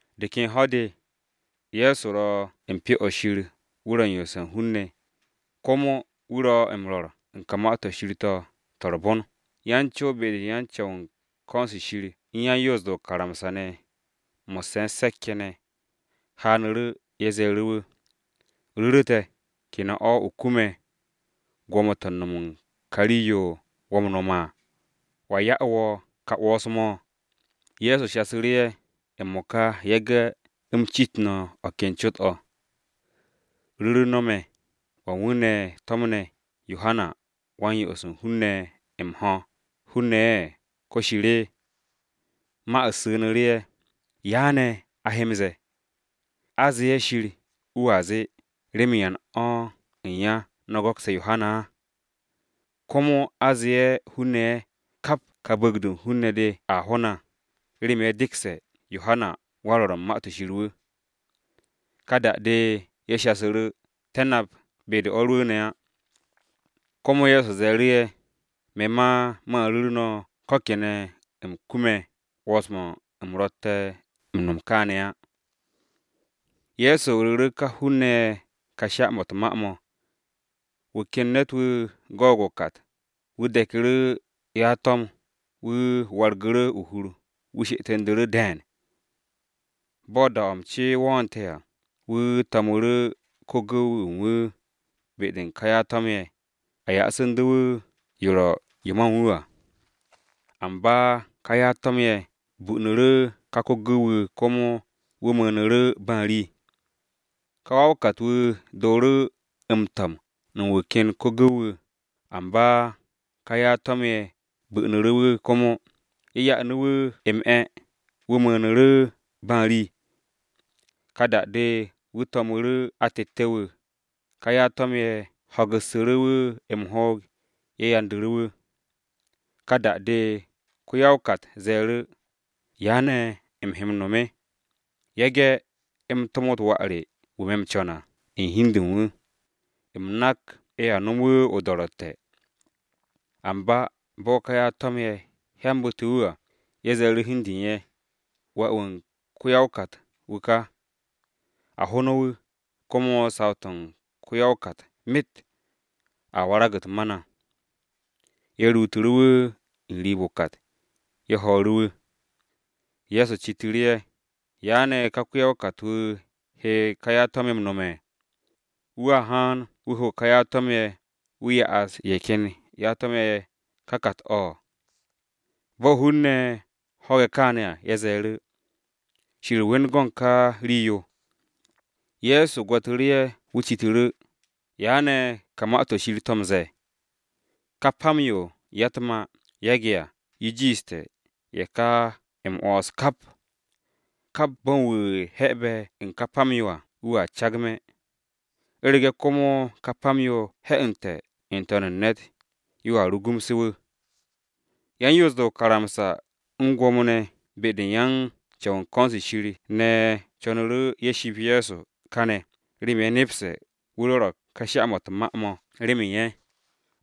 De ken ho̱-de, Ye̱so ro̱ u̱n Pyo-o̱ Shir, wu̱ ro̱ m-yoose̱ u̱n hun-ne̱, komo wu̱ ro̱ u̱n rwo̱r u̱n ka Ma-to̱ Shir to̱, Ma-to̱ m-Re̱re̱m, Gwo̱mo-ne̱ ye̱ u̱n ko̱n-se Shir u̱n yan-Yoos-de o-karamsa ne̱, mo̱sse̱ u̱n se̱k-ye̱ ne̱, haanu̱ru̱. Ye̱ ze̱e̱ru̱ wu̱, “Ru̱ru̱ te̱, ¿kene̱ o̱ o kume̱ gwo̱mo-to̱ u̱n no̱m u̱n ka rii-yo wo̱ m-no̱m à? ¿Wa ya'e̱ wo̱ ka 'wo̱ns-mo̱?” Ye̱so shasu̱ru̱ ye̱, “M-mo̱ka yage̱ u̱m cit no̱ o̱ ken cot-o̱: Ru̱ru̱ no̱ me̱, ¿wa u̱n wu̱ ne̱ to̱mne̱ Yohana Wan-Yo'os u̱n hun-ne̱ n-me̱ m-ho̱, ‘hun-ne̱’ ye̱, ko, ‘Shir’?” Ma-u̱t su̱nu̱ru̱ ye̱, “¿Ya ne̱ a he m-ze̱e̱? A ze'e̱, ‘Shir,’ wu̱a zee, ‘¿Remen yan o̱ u̱n ya no̱ go̱kste̱ Yohana?’ Komo a ze'e̱, ‘Hun-ne̱’ ye̱, kap ka bu̱u̱g-de u̱n hun-ne̱ dea ho na, remen ye̱ dekse̱ Yohanawan-Rwo̱r u̱n Ma-to̱ Shir wu̱.” Ka da-de ye̱ shasu̱ru̱, “Te̱ nap be-de o̱ rwu̱u̱ne̱ á.” Komo Ye̱so ze̱e̱ru̱ ye̱, “Me̱ ma man ru̱ru̱ no̱ ko kene̱ u̱m kume̱ 'wo̱ns-mo̱ u̱m ro̱tte̱ u̱n no̱m kaane̱ á.” Ye̱so ru̱ru̱ ka hun-ne̱ ye̱ ka sha-mo̱ u̱t-ma mo̱: “Wu̱ ken ne̱t-wu̱ go̱o̱g o-kat, wu̱ de̱ku̱ru̱ ya-to̱m, wu̱ wargu̱ru̱ o-hur wu̱ she'etu̱ndu̱ru̱ de̱e̱n. Bo̱ da-o̱ m-ce wo̱o̱nte̱ à, wu̱ to̱mu̱ru̱ ko-gu̱w-wu̱ u̱n wu̱ be-de u̱n ka ya-to̱m-ye̱, a ya'su̱nde̱ wu̱ yo ro̱ yo ma u̱n wu̱ à. Amba ka ya-to̱m-ye̱ bunu̱ru̱ ka ko-gu̱w-wu̱, komo wu̱ mu̱u̱nu̱ru̱ ba u̱n rii. Ka wa-o-kat-wu̱ dooru̱ m-to̱m u̱n wu̱ ken ko-gu̱w-wu̱, amba ka ya-to̱m-ye̱ bunu̱ru̱ wu̱ komo, ye̱ ya'u̱ wu̱ m-'e̱, wu̱ mu̱u̱nu̱ru̱ ba u̱n rii. Ka da-de, wu̱ to̱mu̱ru̱ atette̱-wu̱, ka ya-to̱m-ye̱ ho̱gu̱ssu̱ru̱ wu̱ m-hoog, ye̱ yandu̱ru̱ wu̱. Ka da-de, ko-ya-o-kat ze̱e̱ru̱, ‘¿Ya ne̱ u̱m he m-no̱m? Yage̱ u̱m tomot wà re wu̱ me̱ m-co̱n à u̱n hi u̱n de u̱n wu̱, u̱m nak ye̱a nomo wu̱ o-do̱ro̱tte̱!’ Amba bo̱ ka ya-to̱m-ye̱ hyambu̱te̱ wu̱ à, ye̱ ze̱e̱ru̱ hi u̱n de u̱n ye̱, ‘Wà-wu̱ u̱n ko-ya-o-kat-wu̱ ka. A ho no̱ wu̱, komo saw-to̱ u̱n ko-ya-o-kat myet a warag-u̱t ma na!’ Ye̱ ruutu̱ru̱ wu̱ n-riib o-kat, ye̱ ho̱o̱ru̱ wu̱.” Ye̱so citu̱ru̱ ye̱, “¿Ya ne̱ ka ko-ya-o-kat-wu̱ he ka yan-to̱m-ye̱ m-no̱m? Wu̱a haan wu̱ ho ka yan-to̱m-ye̱, wu̱ ya'as ye̱ ken ya-to̱m-ye̱ ka kat-o̱.” Bo̱ hun-ne̱ ho̱ge̱ kaane̱ à, ye̱ ze̱e̱ru̱, “Shir we̱n go̱n ka rii-yo!” Ye̱so gwo̱tu̱ru̱ ye̱, wu̱ citu̱ru̱, “¿Ya ne̱ ka Ma-to̱ Shir to̱ ro̱ m-ze̱e̱? ‘Ka pam-yo ya-u̱t-mà yage̱ à, yo jiishte̱ ye̱ ka m-'wo̱ns kap.’ Kap bo̱n wu̱ 'he̱be̱ u̱n ka pam-yo à wu̱a cagme̱, u̱rege̱ komo ka pam-yo he̱'e̱nte̱ n-to̱n u̱n ne̱t, yo à rugumse̱ wu̱.” Yan-Yoos-de o-karamsa u̱n Gwo̱mo-ne̱ ye̱ u̱n ko̱n-se Shir ne̱ co̱nu̱ru̱ ye̱ ship Ye̱so kane̱ remen ye̱ nepse̱ wu̱ rwo̱ro̱g ka sha-mo̱ u̱t-ma mo̱ remen ye̱,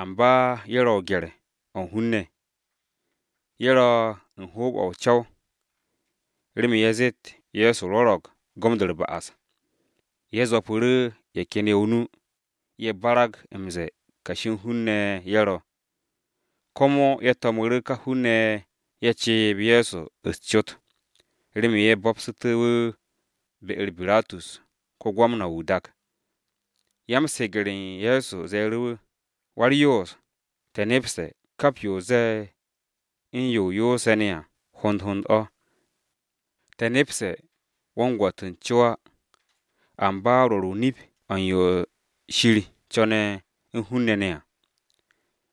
amba ye̱ ro̱ o-gye̱r o̱ u̱n hun-ne̱. Ye̱ ro̱ u̱n hoob-o̱ o-co̱w remen ye̱ zeet Ye̱so rwo̱ro̱g gom-de u̱r-ba'as. Ye̱ zwo̱pu̱ru̱ ye̱ ken ye̱ o-nu, ye̱ barag m-ze̱e̱ kashi u̱n hun-ne̱ ye̱ ro̱. Komo ye̱ to̱mu̱ru̱ ka hun-ne̱-ye̱ ceeb Ye̱so u̱s-cot, remen ye̱ bo̱bsu̱te̱ wu̱, be-u̱r Biratus, ko-Gwamna-wu̱ o-dak. Ya-m-se̱ge̱r u̱n Ye̱so ze̱e̱ru̱ wu̱, “Wa-u̱r-Yoos, te̱ nepse̱ kap yo o ze̱e̱, u̱n yo o yoose̱ ne̱ à, hond hond o̱. Te̱ nepse̱ wo̱ u̱n gwo̱t u̱n co á, amba rwo̱r o-nip o̱ u̱n yo Shir co̱ne̱ u̱n hun-ne̱ ne̱ à.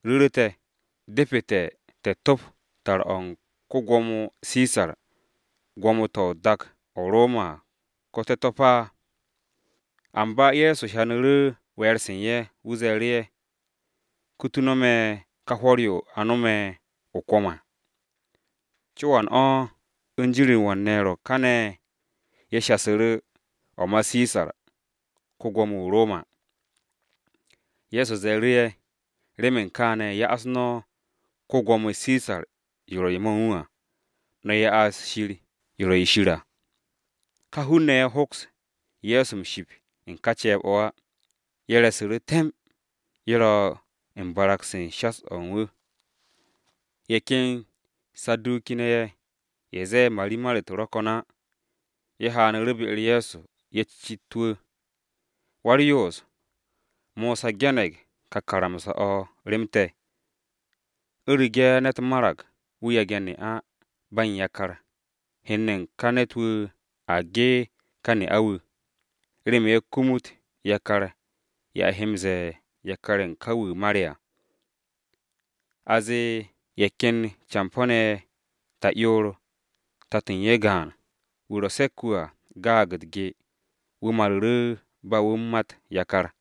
Ru̱ru̱ te̱, ¿depete̱ te̱ top tar-o̱ u̱n ko-Gwo̱mo Sisar, gwo̱mo-to̱ o-dak o-Roma, ko te̱ to̱p á?” Amba Ye̱so hyanu̱ru̱ we̱e̱r-se u̱n ye̱, wu̱ ze̱e̱ru̱ ye̱, “Kutu no̱ me̱ ka hwo̱r-yo a no̱me̱ o-kwo̱m à. ¿Co-o wan o̱, u̱n jin-u̱r wan ne̱ ro̱ kane̱?” Ye̱ shasu̱ru̱, “O̱ ma Sisar, ko-Gwo̱mo-wu̱ o-Roma.” Ye̱so ze̱e̱ru̱, “Remen kaane̱, ya'as no̱ ko-Gwo̱mo Sisar yo ro̱ yo ma u̱n wu̱ à, no̱ ya'as Shir yo ro̱ yo u̱n Shir à.” Ka hun-ne̱ ye̱ hoks Ye̱so m-ship u̱n ka ceeb-o̱ á, ye̱ re̱su̱ru̱ temb, ye̱ ro̱ u̱n barag-se u̱n shas-o̱ u̱n wu̱. Ye̱ ken Saduki-ne̱ ye̱, (ye̱ zee a ine̱ u̱t-marimar á), ye̱ haanu̱ru̱ be-u̱r Ye̱so. Ye̱ cit wu̱, “Wa-u̱r-Yoos, Mosa ge̱ne̱g ka karamsa-o̱ rem te̱. ‘U̱rege̱ ne̱t marag wu̱ yage̱ ne'a ba u̱n yakar, hen-ne̱ u̱n ka ne̱t-wu̱ a ge ka ne'a-wu̱, remen ye̱ kumut yakar-ye̱ a he m-ze̱e̱ yakar-ye̱ u̱n ka wu̱ mare̱ à.’ A zee ye̱ ken campo̱-ne̱ ye̱ ta'yoor, tato̱ u̱n ye̱ gaan, wu̱ ro̱ se̱k-wu̱ à gaag u̱t-ge wu̱ maru̱ru̱ ba wu̱ u̱n mat yakar.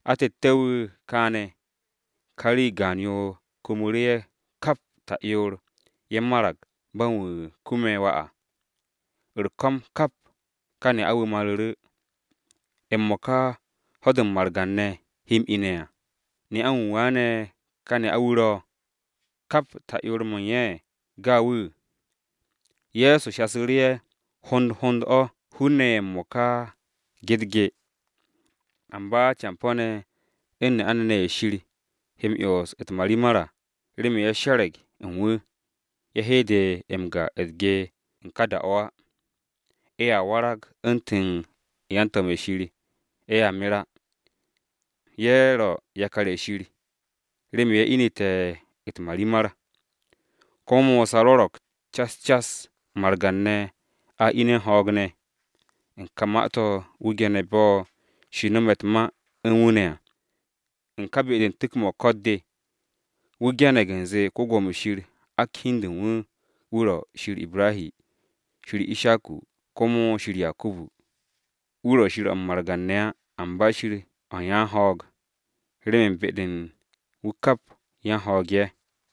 Atette̱-wu̱ kaane̱, ka rii gaan-yo kumu̱ru̱ ye̱ kap ta'yoor, ye̱ marag ba u̱n wu̱ kume̱ wà á. U̱r-ko̱m kap, ka ne'a-wu̱ maru̱ru̱. M-mo̱ka, ¿ho̱-de margan-ne̱ he m-ine̱ à, ne'a-wu̱ waane̱ ka ne'a-wu̱ ro̱? Kap ta'yoor mo̱ u̱n ye̱, ye̱ gaag wu̱.” Ye̱so shasu̱ru̱ ye̱, “Hond hond o̱ hun-ne̱ ye̱ m-mo̱ka ge u̱t-ge. Amba campo̱-ne̱ u̱n ne'a-ne̱ ne̱ ye̱ Shir he m-'yons u̱t-marimar à, remen ye̱ she̱re̱g u̱n wu̱, ye̱ he de m-ga u̱t-ge, u̱n ká da-o̱ á. Ye̱a warag u̱ntu̱n yan-to̱m-ye̱ Shir, ye̱a mer á. Ye̱ ro̱ yakar-ye̱ Shir, remen ye̱ inu̱te̱ u̱t-marimar. Komo Mosa rwo̱ro̱g cas cas, margan-ne̱ a ine̱ u̱n ho̱o̱g ne̱. U̱n ka ma-to̱ wu̱ ge̱ne̱ bo̱ Shir no̱me̱ u̱t-ma u̱n wu̱ ne̱ à, u̱n ka be-de u̱n tu̱k-mo̱ u̱r-ran-de. Wu̱ ge̱ne̱g u̱nze Wan-Ko̱yan, ak hi u̱n de u̱n wu̱, wu̱ ro̱ ‘Shir Ibrahi, Shir Ishaku, komo Shir Yakubu.’ Wu̱ ro̱ Shir o̱ u̱n margan-ne̱ á, amba Shir o̱ u̱n yan-ho̱o̱g, remen be-de u̱n wu̱ kap yan-ho̱o̱g ye̱.”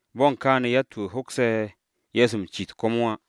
Bo̱ u̱n kaane̱, yatt-wu̱ hokse̱ Ye̱so m-cit komo á.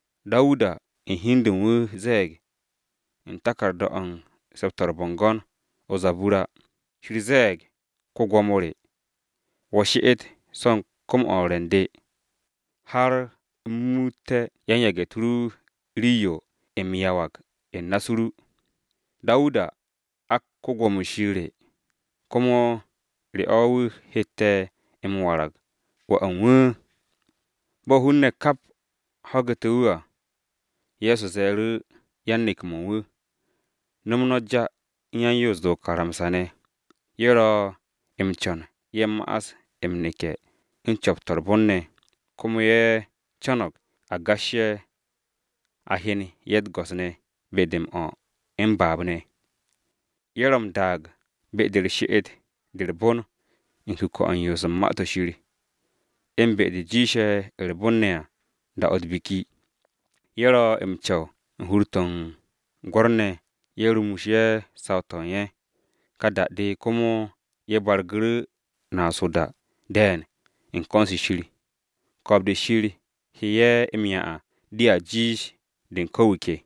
Dawuda u̱n hi u̱n de u̱n wu̱ ze̱e̱g u̱n taku̱rda-o̱ u̱n Se̱p-to̱ u̱r-Bo̱ngo̱n, “ ‘Yawe ze̱e̱g Go̱s-wu̱ re: “She'et u̱n ka be-de u̱t-gwo̱mo de, Har u̱m ru̱'u̱t yan-yage̱-u̱t ru waragte̱ rii-yo o he m-yawag u̱n na-u̱s ru à!” ’ Dawuda ak wu̱ ‘Go̱s-wu̱,’ komo ¿re o̱, wu̱ hette̱ m-warag ‘wà u̱n wu̱’?” Bo̱ hun-ne̱ kap ho̱gu̱te̱ wu̱ à, Ye̱so ze̱e̱ru̱ yan-neke̱-mo̱ u̱n wu̱, “No̱m no̱ ja u̱n yan-Yoos-de o-karamsa ne̱, ye̱ ro̱ m-co̱n ye̱ ma'as m-neke̱ u̱n co̱p-to̱ u̱r-bon ne̱, komo ye̱ co̱no̱g a gas ye̱, a hyen ye̱ u̱t-go̱s ne̱ be-de m-o̱ m-baab ne̱. Ye̱ ro̱ m-daag be-de u̱r-she'et de u̱r-bon u̱n kuke̱-to̱ u̱n yoos u̱n Ma-to̱ Shir, u̱n be-de jiishe̱ u̱r-bon ne̱ à da-o̱ u̱t-biki. Ye̱ ro̱ m-co̱w u̱n hur-to̱ u̱n gwo̱r-ne̱ ye̱ rumus ye̱ saw-to̱ u̱n ye̱, ka da-de komo ye̱ bargu̱ru̱ naas o-da de̱e̱n u̱n ko̱n-se Shir! Ko̱o̱b-de Shir he ye̱ m-'ya à dea jiish de u̱n ko̱ wu̱ ke!”